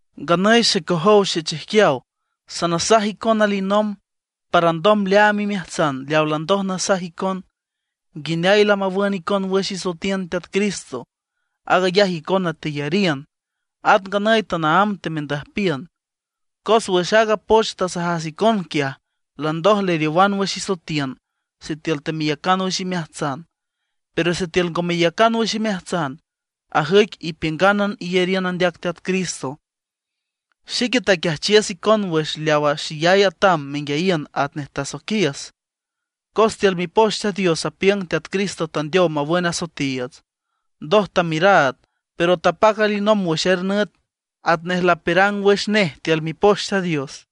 Nganüy xecojow xechijquiaw, sanasaj icon alinomb para alndom leaam imeajtsan leawa landoj nasaj icon, nguineay lamawün icon wüx isoetiün Teat Cristo. Aag ayaj icona teyariün, at nganüy tanaámb temendüjpiün. Cos wüx aaga poch tasajas icon quiaj, landoj leriowan wüx isoetiün sitiül temeyacan wüx imeajtsan. Pero sitiül ngo meyacan wüx imeajtsan, ajüic ipiüngánan iyariün andeac Teat Cristo. Xique taquiajchiüs icon wüx leawa xeyay atam menguiayiün atnej tasoiquiüs, cos tiül Mipoch Teat Dios apiüng Teat Cristo tandeow mawün asoetiiüts. Ndoj tamiüraad, pero tapac alinomb wüx er nüt, atnej lapiürang wüx nej tiül Mipoch Teat Dios.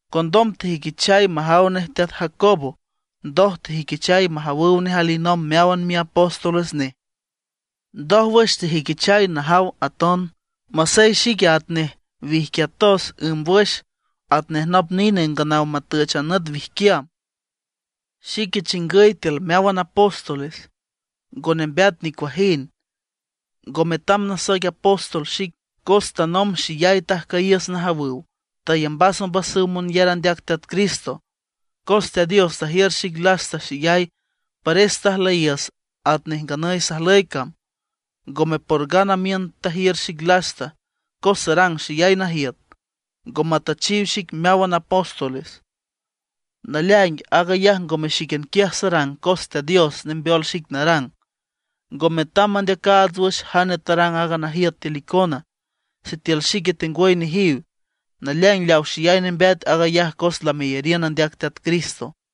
Condom tejüiquichay majaw nej teat Jacobo. Ndoj tejüiquichay majawüw nej alinomb meáwan miapóstoles nej. Ndójwüx tejüiquichay najaw aton, masey xique atnej wijquiatos ǘmbwüx, atnej nop nine nganaw matüch a nüt wijquiam. Xique chingüy tiül meáwan apóstoles, ngo nembeat nicuajind, ngo metam nasoic apóstol xic, cos tanomb xeyay tajcüyiüs najawüw; tayambas ombasüw monyar andeac Teat Cristo. Cos Teat Dios tajiür xic lasta xeyay, pares tajlüyiüs atnej nganüy sajlüy cam. Ngome por gana miün tajiür xic lasta, cos sarang xeyay najiüt, ngo matüchiw xic meáwan apóstoles. Naleaing aag ayaj ngome xíquian quiaj sarang, cos Teat Dios nembeol xic narang. Ngo metam mandeacaats wüx jane tarang aaga najiüt tiül icona, sitiül xique tengwüy nejiw. Naleaing leaw xeyay nembeat, aag ayaj cos lameyariün andeac Teat Cristo.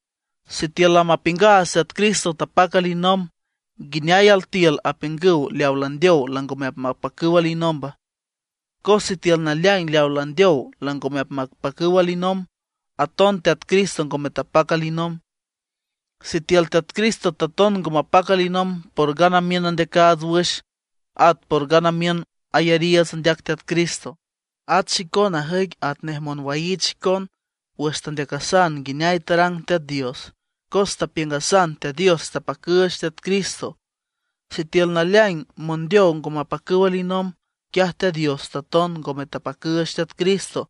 Sitiül lamapiüngaats Teat Cristo tapac alinomb, ¿nguineay altiül apiüngüw leaw landeow langome apmapacüw alinomba? Cos sitiül naleaing leaw landeow langome apmapacüw alinomb, aton Teat Cristo ngome tapac alinomb. Sitiül Teat Cristo taton ngo mapac alinomb, por gana miün andeacaats wüx, at por gana miün ayariiüts andeac Teat Cristo. At xicona ajüic atnej monwaiich xicon wüx tandeacasan nguineay tarang Teat Dios, cos tapiüngasan Teat Dios tapacüüch Teat Cristo. Sitiül naleaing mondeow ngo mapacüw alinomb, quiaj Teat Dios taton ngome tapacüüch Teat Cristo.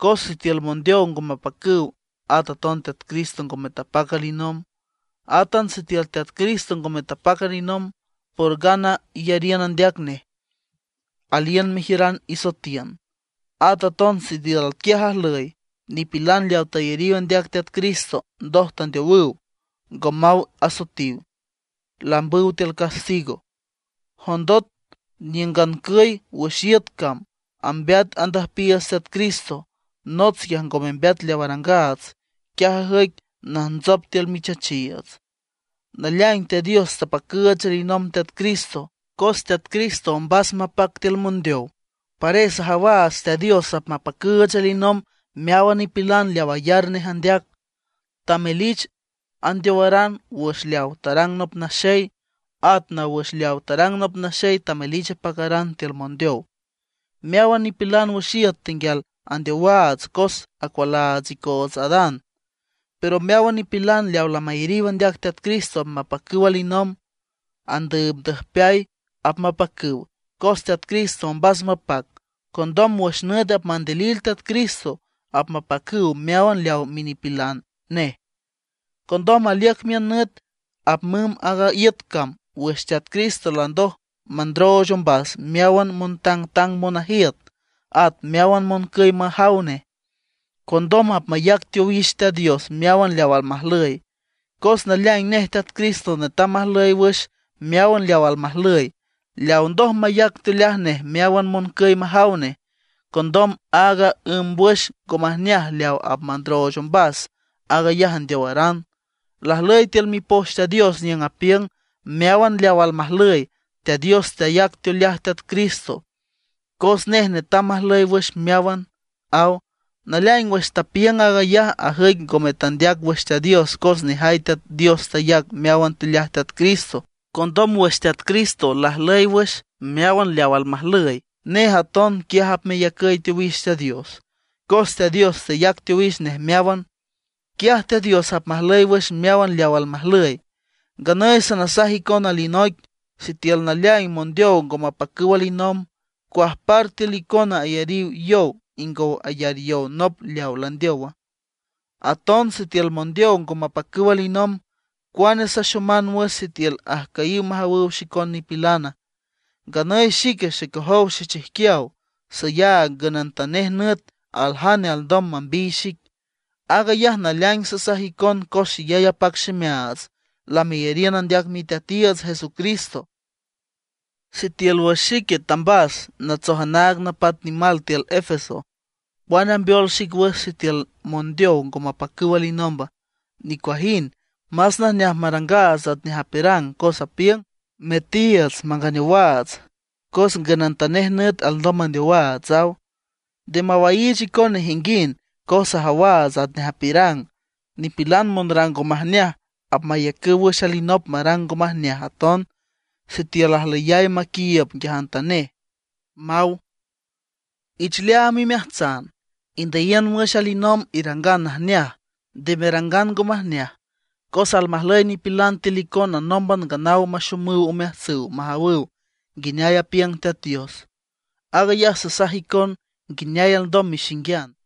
Cos sitiül mondeow ngo mapacüw, at aton Teat Cristo ngome tapac alinomb. Átan sitiül Teat Cristo ngome tapac alinomb, por gana iyariün andeac nej, aliün mejiüran isoetiün. At aton sitiül atquiaj ajlüy, nipilan leaw tayariw andeac Teat Cristo ndoj tandeowüw, ngo maw asoetiw, lambüw tiül castigo. Jondot niüngancüy wüx iüt cam ambeat andüjpiiüts Teat Cristo, nots quiaj ngo membeat leaw arangaats, quiaj ajüic najntsop tiül michachiiüts. Naleaing Teat Dios tapacüüch alinomb Teat Cristo. Cos Teat Cristo ombas mapac tiül mondeow, pares ajawaats Teat Dios apmapacüüch alinomb meáwan nipilan leaw ayar nej andeac. Tamelich andeowaran wüx leaw tarang nop naxey; at naw wüx leawa tarang nop naxey tamelich apacaran tiül mondeow. Meáwan nipilan wüx iüt tenguial andeowaats cos acualaats icoots Adán; pero meáwan nipilan leaw lamayariw andeac Teat Cristo apmapacüw alinomb. Andüübndüjpeay apmapacüw, cos Teat Cristo ombas mapac. Condom wüx nüt apmandilil Teat Cristo, apmapacüw meáwan leaw minipilan nej. Condom aliüc miün nüt apmümb aaga iüt cam wüx Teat Cristo landoj mandrooch ombas meáwan montangtang monajiüt, at meáwan moncüy majaw nej. Condom apmayac teowix Teat Dios meáwan leaw almajlüy. Cos naleaing nej Teat Cristo netam majlüy wüx meáwan leaw almajlüy, leaw ndoj mayac teoleaj nej meáwan moncüy majaw nej. Condom aaga ǘmbwüx ngo majneaj leaw nej apmandrooch ombas, aag ayaj andeowaran. Lajlüy tiül Mipoch Teat Dios niüng apiüng: “Meáwan leaw almajlüy, Teat Dios tayac teoleaj Teat Cristo, cos nej netam majlüy wüx meáwan”, aw. Naleaing wüx tapiüng aag ayaj ajüic ngome teandeac wüx Teat Dios cos nejay Teat Dios tayac meáwan teoleaj Teat Cristo. Condom wüx Teat Cristo lajlüy wüx meáwan leaw almajlüy, nej aton quiaj apmeyacüy teowix Teat Dios, cos Teat Dios tayac teowix nej meáwan. Quiaj Teat Dios apmajlüy wüx meáwan leaw almajlüy. Nganüy sanasaj icon alinoic. Sitiül naleaing mondeow ngo mapacüw alinomb, ¿cuajpar altiül icona ayariw yow ingow ayar yow nop leaw landeowa? Aton sitiül mondeow ngo mapacüw alinomb, ¿cuane saxoman wüx sitiül ajcüyiw majawüw xicon nipilana? Nganüy xique, xecojow xechijquiaw, sayaag ngünantanej nüt aljane alndom mambiy xic. Aag ayaj naleaing sasaj icon cos xeyay apac ximeaats lameyariün andeac Miteatiiüts Jesucristo. Sitiül wüx xique tambas natsoj anaag napat nimal tiül Efeso, ¿cuane ambeol xic wüx sitiül mondeow ngo mapacüw alinomba? ¡Nicuajind! Más najneaj marangaats atnej apiürang, cos apiüng: “Metiiüts manganeowaats, cos ngünantanej nüt alndom mandeowaats”, aw. Nde mawaiich icon nejinguind, cos ajawaats atnej apiürang: “Nipilan monrang ngo majneaj apmayacüw wüx alinop marang ngo majneaj aton sitiül ajlüyay maquiiüb nguiajantanej”, maw. Ich leaam imeajtsan, indüyiün wüx alinomb irangan najneaj, nde merangan ngo majneaj. Cos almajlüy nipilan tiül icona nómban nganaw maxomüw omeajtsüw majawüw nguineay apiüng Teat Dios. Aag ayaj sasaj icon nguineay alndom mexinguian.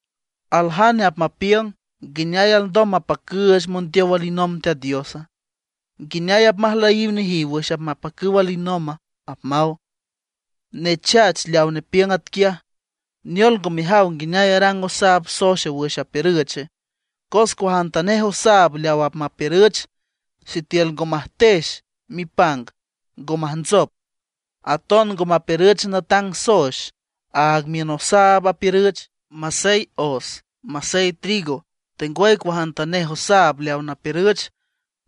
Aljane apmapiüng: “¿Nguineay alndom mapacüüch mondeow alinomb Teat Diosa? ¿Nguineay apmajlüyiw nejiw wüx apmapacüw alinomba?” apmaw. ¡Nechach leaw nepiüng atquiaj! ¿Neol ngo mejaw nguineay arang osaab soex wüx apiürüche? Cos cuajantanej osaab leaw apmapiürüch, sitiül ngo majtex mipang, ngo majntsop. Aton ngo mapiürüch natang soex, aag miün osaab apiürüch, masey os masey trigo, tengwüy cuajantanej osaab leaw napiürüch.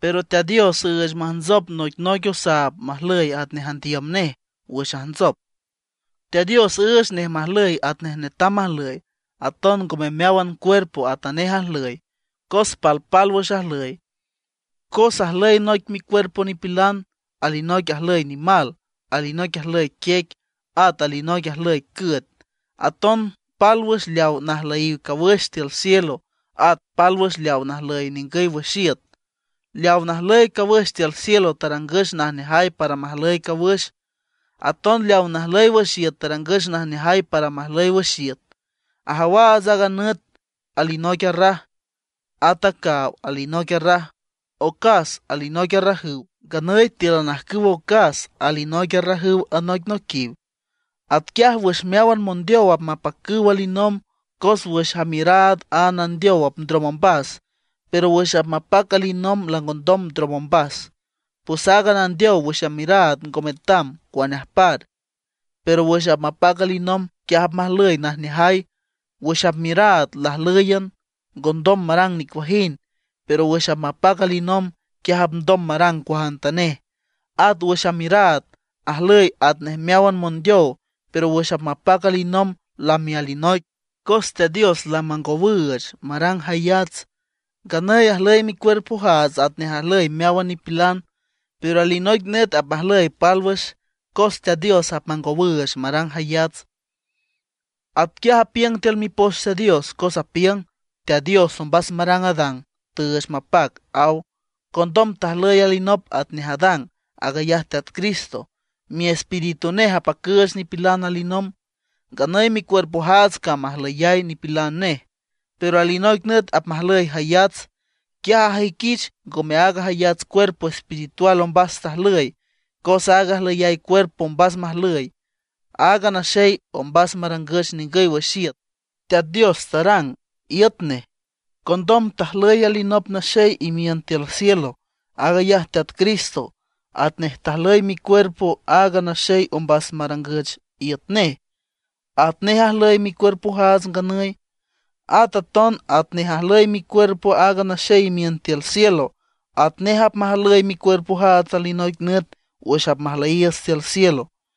Pero Teat Dios üüch majntsop noicnoic osaab majlüy atnej andiüm nej; wüx ajntsop, Teat Dios üüch nej majlüy atnej netam majlüy. Aton ngome meáwan cuerpo atanej ajlüy, cos palpálwüx ajlüy. Cos ajlüy noic micuerpo nipilan, alinoic ajlüy nimal, alinoic ajlüy quiec, at alinoic ajlüy cüet. Aton pálwüx leaw najlüyiw cawüx tiül cielo, at pálwüx leaw najlüy ningüy wüx iüt. Leaw najlüy cawüx tiül cielo tarangüch najneajay para majlüy cawüx. Aton leaw najlüy wüx iüt tarangüch najneajay para majlüy wüx iüt. Ajawaats aaga nüt alinoic arraj, at a caaw alinoic arraj, ocas alinoic arrajüw; nganüy tíülan ajcüw ocas alinoic arrajüw anoicnoiquiw. Atquiaj wüx meáwan mondeow apmapacüw alinomb, cos wüx amiüraad a nandeow apndrom ombas; pero wüx apmapac alinomb langondom ndrom ombas. Pues aaga nandeow wüx amiüraad ngo metam, cuane ajpar. Pero wüx apmapac alinomb, quiaj apmajlüy najneajay. Wüx amiüraad lajlǘyan, ngondom marang nicuajind; pero wüx apmapac alinomb, quiaj apndom marang cuajantanej. At wüx amiüraad, ajlüy atnej meáwan mondeow; pero wüx apmapac alinomb lami alinoic, cos Teat Dios lamangowüüch marang jayats. Nganüy ajlüy micuerpojaats atnej ajlüy meáwan nipilan. Pero alinoic nüt apmajlüy pálwüx, cos Teat Dios apmangowüüch marang jayats. Atquiaj apiüng tiül Mipoch Teat Dios, cos apiüng: “Teat Dios ombas marang Adán, tüüch mapac”, aw. Condom tajlüy alinop atnej Adán, aag ayaj Teat Cristo; Miespíritu nej apacüüch nipilan alinomb. Nganüy micuerpojaats cam ajlüyay nipilan nej, pero alinoic nüt apmajlüy jayats. Quiaj ajüiquich ngome aaga jayats cuerpo espiritual ombas tajlüy, cos aaga ajlüyay cuerpo ombas majlüy. Aaga naxey ombas marangüch ningüy wüx iüt, Teat Dios tarang iüt nej. Condom tajlüy alinop naxey imiün tiül cielo, aag ayaj Teat Cristo. Atnej tajlüy micuerpo aaga naxey ombas marangüch iüt nej, atnej ajlüy micuerpojaats nganüy. At aton atnej ajlüy micuerpo aaga naxey imiün tiül cielo, atnej apmajlüy micuerpojaats alinoic nüt wüx apmajlüyiiüts tiül cielo.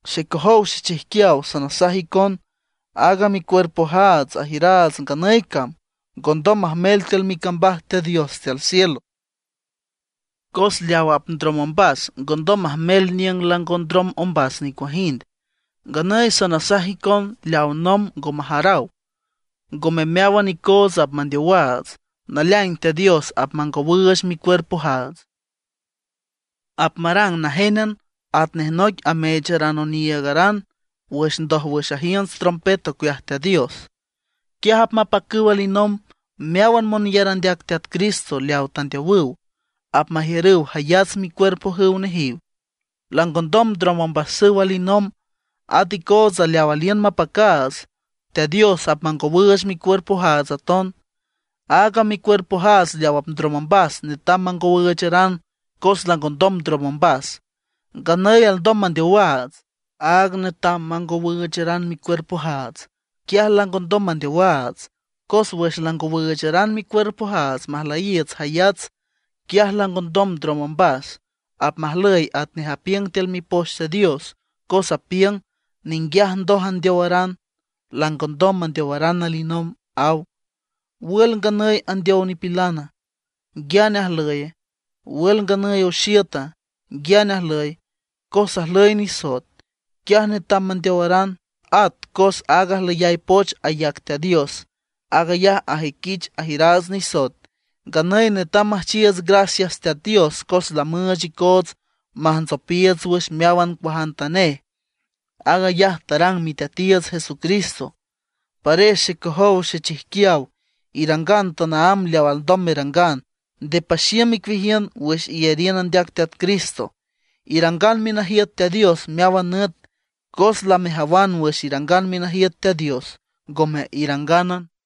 Xecojow xechijquiaw sanasaj icon, aaga micuerpojaats ajiüraats nganüy cam ngondom majmel tiül micambaj Teat Dios tiül cielo; cos leaw apndrom ombas ngondom majmel niüng lango ndrom ombas nicuajind. Nganüy sanasaj icon leaw nomb ngo majaraw. Ngome meáwan icoots apmandeowaats; naleaing Teat Dios apmangowüüch micuerpojaats. Apmarang najénan, atnej noic ameecharan oniiügaran wüx ndójwüx ajiünts trompet ocueaj Teat Dios. Quiaj apmapacüw alinomb meáwan monyar andeac Teat Cristo leawa tandeowüw, apmajiürüw jayats micuerpojüw nejiw, langondom ndrom ombasüw alinomb. At icootsa leaw aliün mapacaats, Teat Dios apmangowüüch micuerpojaats aton. Aaga micuerpojaats leaw apndrom ombas netam mangowüücharan cos langondom ndrom ombas. Nganüy alndom mandeowaats, áag netam mangowüücharan micuerpojaats, quiaj langondom mandeowaats. Cos wüx langowüücharan micuerpojaats majlüy jayats, quiaj langondom ndrom ombas; apmajlüy atnej apiüng tiül Mipoch Teat Dios, cos apiüng: “Ninguiaj ndoj andeowaran, langondom mandeowaran alinomb”, aw. ¿Wül nganüy andeow nipilana? ¿Nguiane ajlüye? ¿Wül nganüy oxiüta? ¿Nguiane ajlüye? Cos ajlüy nisoet, quiaj netam mandeowaran; at cos aaga ajlüyay poch ayac Teat Dios, aag ayaj ajüiquich ajiüraats nisoet. Nganüy netam müjchiiüts gracias Teat Dios, cos lamüüch icoots majntsopiiüts wüx meáwan cuajantanej. Aag ayaj tarang Miteatiiüts Jesucristo. Pares xecojow xechijquiaw, irangan tanaámb leaw alndom merangan, nde paxiüm icueajiün wüx iyariün andeac Teat Cristo. Irangan minajiüt Teat Dios meáwan nüt, cos lamejawan wüx irangan minajiüt Teat Dios ngome irangánan.